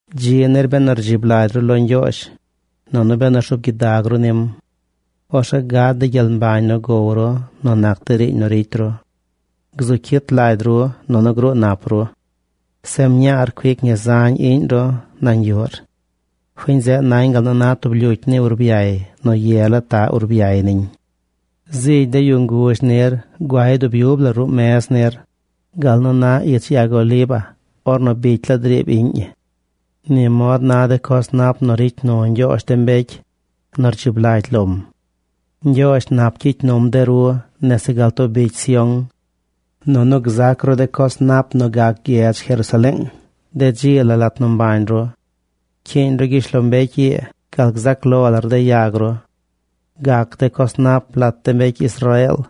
Dzi nir benu rdzib lagy ru lo Ñgyoozh, nunu benu rzuub gyidag ru nim. Orzeꞌ gad de gyel mbañ nu gow ru nu nac de riiñ nu ricy ru. Gzu cyit lagy ru, nunu gruu nap ru. Zeꞌ mñaar cuic ñi zañ iꞌñ ru nañ yuꞌr. Fiñ zeꞌ nañ gal nu na tub lyucy ni urbyay nu ye la taꞌ urbyay niñ. Zigy de yu nguzh nir guay dub yub la ruꞌ mez nir, gal nu na ich yag oliva ornu bicy la driib iꞌñ ñi. Ni mod na de coz nap nu ricy nu Ñgyoozh de mbecy nu rdzib lagy lom. ¡Ñgyoozh nap gyicy num de ru nese gal too bicy Sión! ¡Nunu gzac ru de coz nap nu gac gyedz Jerusaleeng de dzi la lat nu mbañ ru! Cyiiñ ru gyishlombecy ii gal gzac lo lar de yag ru. Gac de coz nap lat de mbecy Israeel.